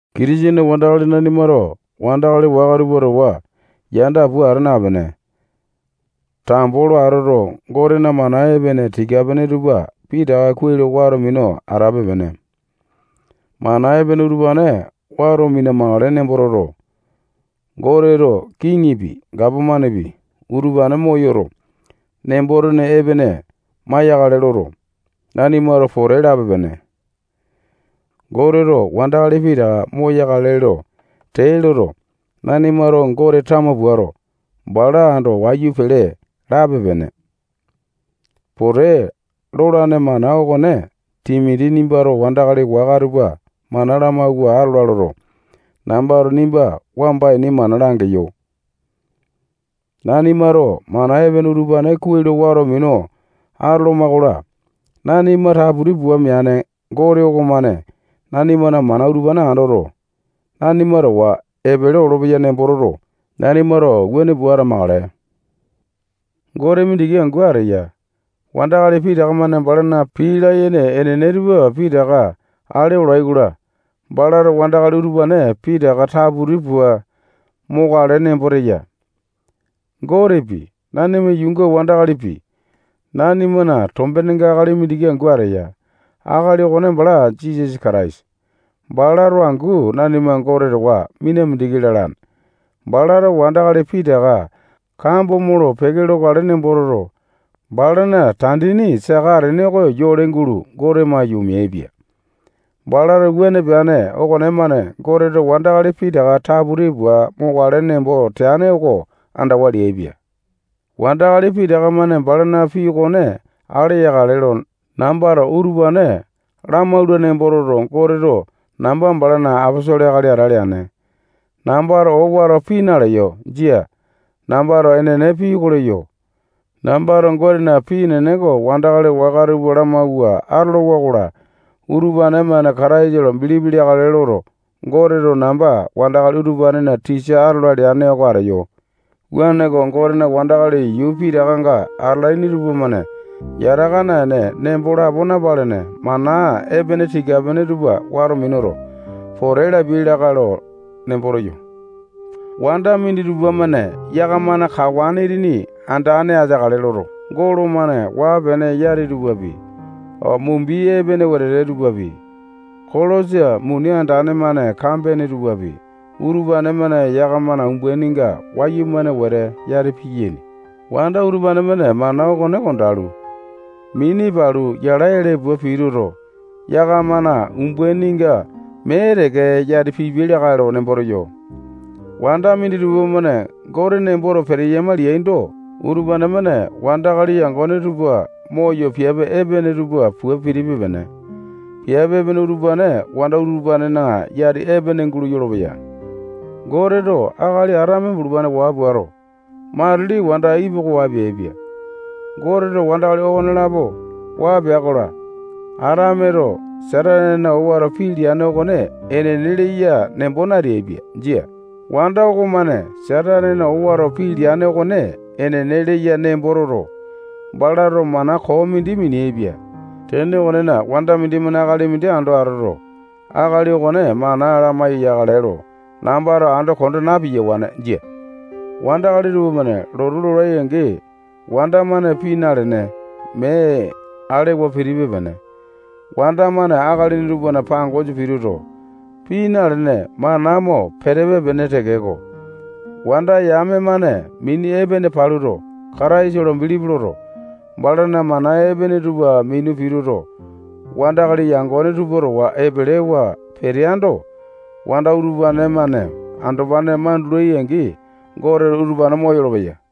Kitisene wandakali nanimato wandakali waka tupa towa yanda pua ata napene, tambo lo atoto, Gotena mana epene tika-pene tupa pitaka kuai lo wato minu atape-pene. Mana epene utupane wato mina-makale nembo toto, Goteto kiŋipi, gapomanepi, utupane moyoto, nembo-tene epene maiyakale loto, nanimato pote lape-pene. Goteto wandakali pitaka moyakale lo tee loto, nanimato Gote tama puato, bala ando wayu pele lape-pene. Pote lolane mana okone Timoti nimbato wandakali waka tupa mana lamawua atola loto, nambato nimba wamba ini mana langeyo. Nanimato mana epene utupane kuai lo wato minu atoloma-kola, nanima taputi pua meane Gote okomane nanimana mana utupane andoto, nanima towa epele olopeya nembo toto, nanimato wuane pua atamakale. Gote mindiki angu ateya. Wandakali pitaka-mane balana pii layene enene tupa pitaka ale olai-kola, balato wandakali utupane pitaka taputi pua mokale nembo teya. Gotepi, nanima yuunga wandakalipi, nanimana tombenenga akali mindiki angu ateya. Akali okone bala Jisasa Kataisa. Balato angu nanima Gote towa mina mindiki lalane. Balato wandakali pitaka kambo molo-peke lokale nembo toto, balana tandini saka atene oko yole gulo Gote maiyu, omeaipia. Balato wuane peane okonemane Goteto wandakali pitaka taputi pua mokale nembo teane oko andawa leaipia. Wandakali pitaka-mane balana pii okone ale yakale lo nambato utupane lamaula nembo toto, Goteto namba balana aposolo akali ate leane. Nambato owato pii naleyo. Jia. Nambato enene pii oko leyo. Nambato Gotena pii enene oko wandakali waka tupa lamawua atolowa-kola, utupane-mane Kataisa lo bilipi leakale loto, Goteto namba wandakali utupanena tisa atola leane oko ateyo. Wuaneko, Gotena wandakali yuu pitakanga atalaini tupamane yataka naene, nembo lapo napalene, mana epene tika-pene tupa wato minuto, pote lapiai lakae lo nembo teyo. Wanda minditupa-mane yakamana kawane itini andane ateakale loto, golo-mane waa-pene yati tupapi, mumbi epene wetete tupapi, kolosa muni andane-mane kambene tupapi, utupane-mane yakamana umbaininga wayumane wete yati piyaini. Wanda utupane-mane mana okone kondalu, mini palu, yala ele pua pituto, yakamana umbaininga mee teke yati pipiai lakae lo nembo teyo. Wanda minditupa-mane Gote nemboto peteyama leaindo, utupane-mane wandakali yangone tupa moyo piape epene tupa pua pitipe-pene. Piape epene utupane wanda utupanena yati epene gulo yolopeya. Goteto akali Atame bulupane waa puato, matili wanda Ipi oko waa peaipia. Goteto wandakali okonelapo waa pea-kola, Atameto Satanena owato pii leane okone enene leya nembo nateaipia. Jia. Wanda okomane Satanena owato pii leane okone enene leya nembo toto, balato mana koo mindi mineaipia. Tene okonena, wanda mindimane akali mindi ando atoto, akali okone mana lamai-yakale lo nambato ando konda na-piyawane. Jia. Wandakali tupamane lotu lolai-angi, wanda-mane pii nalene, mee alewa pitipe-pene. Wanda-mane akalini tupana pangosa pituto, pii nalene, mana mo pitipe-pene tekeko, wanda yame-mane mini epene paluto, Kataisa lo bilipi loto, balana mana epene tupa minu pituto, wandakali yangone tupa towa epelewa peteaindo, wanda utupane-mane andopane mandulai-angi, Goteto utupane moyolo-peya.